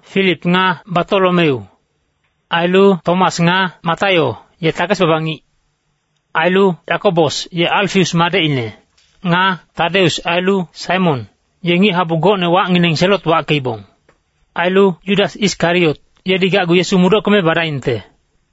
Filip nga Batolomeu. Ailu Tomas nga Mataio, ye takes-baba ngic. Ailu Yakobos, ye Alfaius madecine. Nga Tadeus ailu Saimon, ye ngic-habu gocne wacngineng Selot wackeibong. Ailu Yudas Iskariot, yedi gacgu Yesu mudockeme badaingte.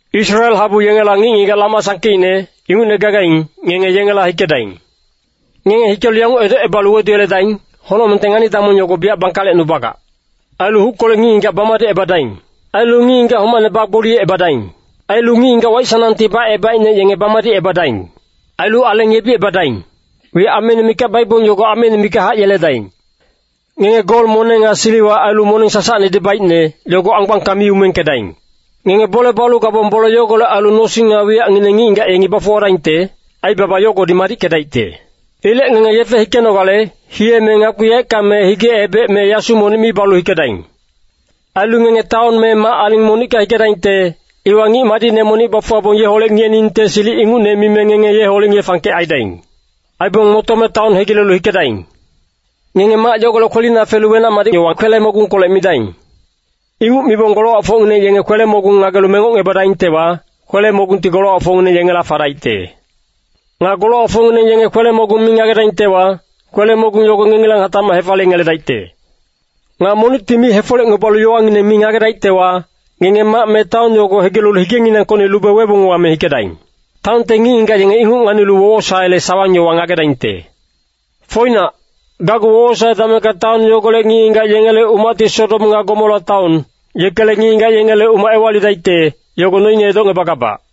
Israel habu yengela ngic-ngigac lama sangkeicne, ingucne gagaing, ngenge yengela hikedaing. Ngenge hikelu yanguc edocebalu weduyeledaing, ‘Honocmengte ngani-damong yogo biyac bangkalecnubagac.’ Ailu huckolec ngic-ngigac bamadicebadaing. Ailu ngic-ngigac homaicne bagboliyecebadaing. Ailu ngic-ngigac waic-sanangti bacebaicne yenge bamadicebadaing. Ailu aleng yebicebadaing. Wiyac ameine mikac baibong yogo ameine mikachac yeledaing. “Ngenge gol moneng nga siliwa ailu moneng sasacnedi baicne, yogo anggbangka mi umengkedaing. Ngenge bole balu gabong bole yogolec ailu nosing nga wiyacngineng ngic-ngigac yengi bafuwadaingte, aibaba yogodi madickedaicte. Ilec ngenge yefe hikenogale, hiye me ngakpi yaeckang me hige-ebec me yasu monic mi balu hikedaing. “Ailu ngenge taon me mac-aling monicka hikedaingte, iwa ngic madicne monic bafuwabong yeholec ngiyeningte silic ingucne mime ngenge yeholec ngiye-fangkec aidaing. Aibong motome taon hegilelu hikedaing. Ngenge mac yogolec kwelina felu wenac-madic yowa kwele-mogungkolec midaing. Inguc mibong golowacfocngineng yenge kwele-mogung ngagelu mengocngebadaingtewa, kwele-mogungti golowacfocngineng yengela fadaicte. Nga golowacfocngineng yenge kwele-mogung mi ngagedaingtewa, kwele-mogung yogo ngengilang hatacmac hefaliyengeledaicte. Nga monicti mi hefolecngebalu yowangineng mi ngagedaictewa, ngenge mac me taon yogo hegilelu higenginangkocni lube webong wame hikedaing. Taonte ngic-ngigac yenge inguc nganilu wowosaele sawang-yowa ngagedaingte. Foinac, gacgu wowosae damengka taon yogolec ngic-ngigac yengele umacti Sodom nga Gomora taon, yekele ngic-ngigac yengele umac ewalidaicte, yogo noine edocngebagabac.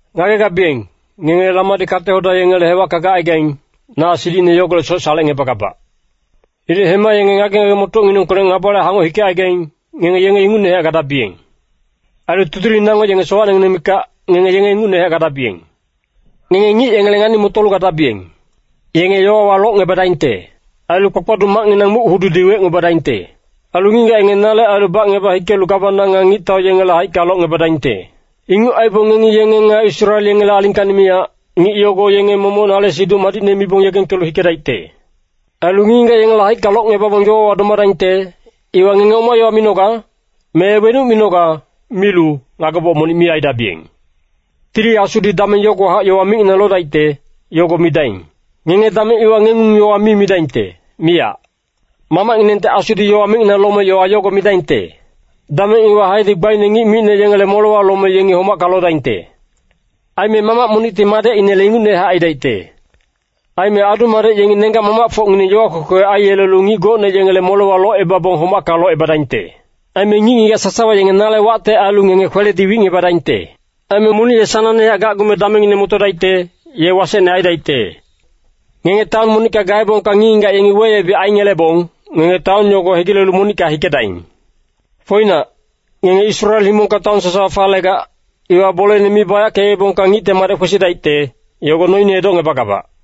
“Ngagegabiyeng, ngenge lamadi kate-hoda yengele hewacka gacaigaing, na silicine yogolecsoc salecngebagabac. Ilec hema yenge ngage-ngage-motocnginengkolec ngabale hangoc hikecaigaing, ngenge yenge ingucnehac gadabiyeng. Ailu tudiling nango yenge sowacnengineng mikac, ngenge yenge ingucnehac gadabiyeng. Ngenge ngic yengele ngani-motolu gadabiyeng. Yenge yowawa locngebadaingte. Ailu kpakpaduc macnginang muc-hududi wecngebadaingte. Ailu ngic-ngigac yengi nale ailu bacngeba hikelu gawana nga ngictau yengele haicka locngebadaingte. Inguc aibong ngengi yenge nga Israel yengele alingkacni miyac, ngic yogo yenge momoc nale Siduc Madicne mibong yegengkelu hikedaicte. Ailu ngic-ngigac yengele haicka locngebabong yowawa domadaingte, iwa ngenge ‘Oma yowa minoga?’ me ‘Wenuc minoga?’ milu, ngageboc monic mi aidabiyeng. Tili Asudi dameng yogowahac yowa micnginang lodaicte, yogo midaing. Ngenge dameng iwa ngengung-yowa mi midaingte, miyac. Mamacnginengte Asudi yowa micnginang lome yowa yogo midaingte. “Dameng iwa haedi gbaine ngic micne yengele molewa lome yengi homacka lodaingte. Aime mamac monicti madecinele ingucnehac aidaicte. Aime adu-madec yengi nenggac-mamacfocngineng yowa kwekwe aiyelelu ngic gocne yengele molewa locebabong homacka locebadaingte. Aime ngic-ngigac sasawa yenge nale wacte ailu ngenge kweledi wicngebadaingte. Aime monic ye sanangnehac gacgume damengine motodaicte, ye wasecne aidaicte. Ngenge taon monicka gaebongka ngic-ngigac yengi weyebic aingelebong, ngenge taon yogo hegilelu monicka hikedaing. Foinac, ngenge Israel himongka taon sasawa falegac, iwa bolene mi bayackeebongka Ngicte Madec kwesidaicte, yogo noine edocngebagabac.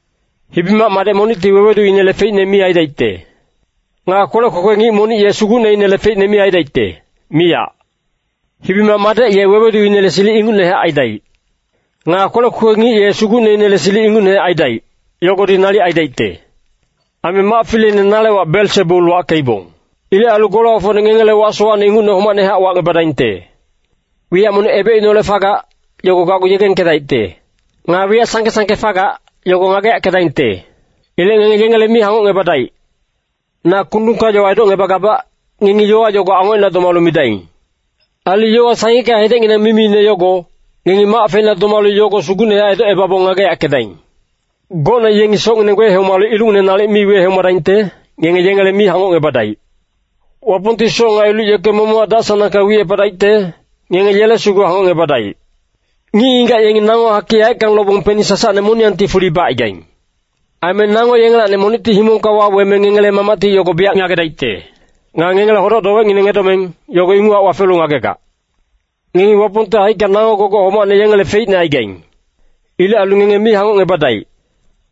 “Hibi-mac madec monicti weweduinele feicne mi aidaicte. Nga kwelec kwekwe ngic monic ye sugucneinele feicne mi aidaicte, miyac. Hibi-mac madec ye weweduinele silic ingucnehac aidaic. Nga kwelec kwekwe ngic ye sugucneinele silic ingucnehac aidaic, yogodi nalic aidaicte. Aime mac fileine nale wac Belsebul wackeibong. Ilec ailu golowacfocne ngengela wac sowacne ingucne homacnehac wacngebadaingte. “Wiyac monic ebecineholec fagac, yogo gacgu yegengkedaicte. Nga wiyac sangke-sangke fagac, yogo ngageyackedaingte. Ilec ngenge yengele mi hangocngebadaic. Na kundungka yowa edocngebagabac, ngengi yowa yogo angocina domalu midaing. Ailu yowa sangicka hedecnginang mimiine yogo, ngengi mac feina domalu yogo sugucnehac edocebabong ngageyackedaing. Gocne yengi socngineng wehomalu ilucngineng nalic mi wehomadaingte, ngenge yengele mi hangocngebadaic. Wapongti soc nga iluc yeke momochac dac-sanangka wicepadaicte, ngenge yele sugu hangocngebadaic. Ngic-ngigac yengi nango hakic yaeckang lobong peni sasacne moniyangti fuli bacaigaing. Aime nango yengelacni monicti himongka waweme ngengele Mamacti yogo biyac ngagedaicte. Nga ngengele hodoc-dowecngineng edomeng, yogo inguchac wafelu ngagegac. Ngengi Wapongte haicka nango gogoc homacne yengele feicne aigaing. Ilec ailu ngenge mi hangocngebadaic.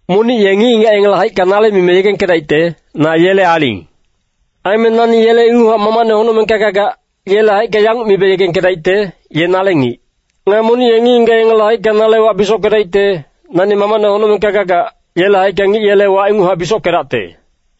“Monic ye ngic-ngigac yengele haicka nale mime yegengkedaicte, ‘Na yele aling.’ Aime nani yele inguchac Mamacne honocmengka gagac, yele haicka yanguc mibe yegengkedaicte, ‘Ye nale ngic.’ Nga monic ye ngic-ngigac yengele haicka nale wac bisockedaicte, nani Mamacne honocmengka gagac, yele haicka ngic yele wac inguchac bisockedacte.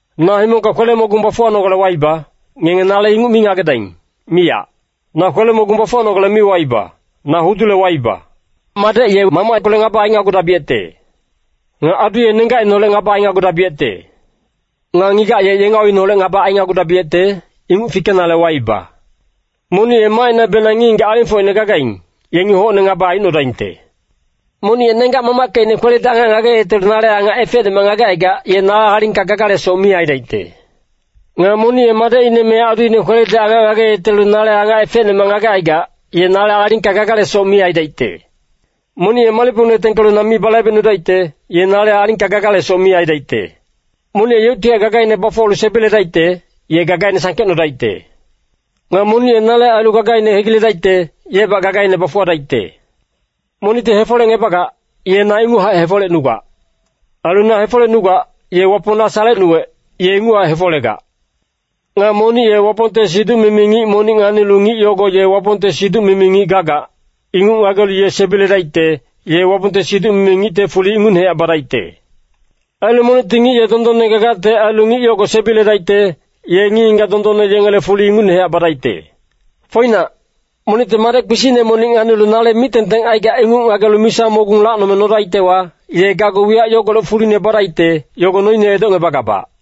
“ ‘Na himongka kwele-mogung bafuwanogale waiba,’ Ngenge nale inguc mi ngagedaing, miyac. Na kwele-mogung bafuwanogale mi waiba, na hudule waiba. ‘Madec ye mamackolec ngaba ainagudabiyecte. Nga adu ye nenggacineholec ngaba ainagudabiyecte. Nga ngigac ye yengauineholec ngaba ainagudabiyecte, inguc fikenale waiba. Monic ye macinabenang ngic-ngigac alingfocine gagaing, yengi hocne ngaba aicnodaingte.’ “Monic ye nenggac-mamackecine kweledi angac ngageyetelu nale angac efecnemac ngagecaigac, ye nale alingka gagalesoc mi aidaicte. Nga monic ye madecine me aduine kweledi angac ngageyetelu nale angac efecnemac ngagecaigac, ye nale alingka gagalesoc mi aidaicte. Monic ye malicpongine tengkelu na mi balaibecnudaicte, ye nale alingka gagalesoc mi aidaicte. Monic ye yeuctihac gagaine bafuwalu sebiledaicte, ye gagaine sangkecnodaicte. Nga monic ye nale ailu gagaine hegiledaicte, yebac gagaine bafuwadaicte. “Monicti hefolecngebagac, ye na inguchac hefolecnugac. Ailu na hefolecnugac, ye Wapong na salecnuwec, ye inguchac hefolegac. Nga monic ye Wapongte siduc-mimi ngic monic nganilu ngic yogo ye Wapongte siduc-mimi ngic gagac, inguc ngagelu ye sebiledaicte, ye Wapongte siduc-mimi ngicte fuli ingucnehac badaicte. Ailu monicti ngic ye dondonne gagacte ailu ngic yogo sebiledaicte, ye ngic-ngigac dondonne yengele fuli ingucnehac badaicte. Foinac, monicti madec kpisicne monic nganilu nale mic-tengteng aigac inguc ngagelu misa mogung lacnome nodaictewa, ye gacgu wiyac yogolec fuline badaicte, yogo noine edocngebagabac.”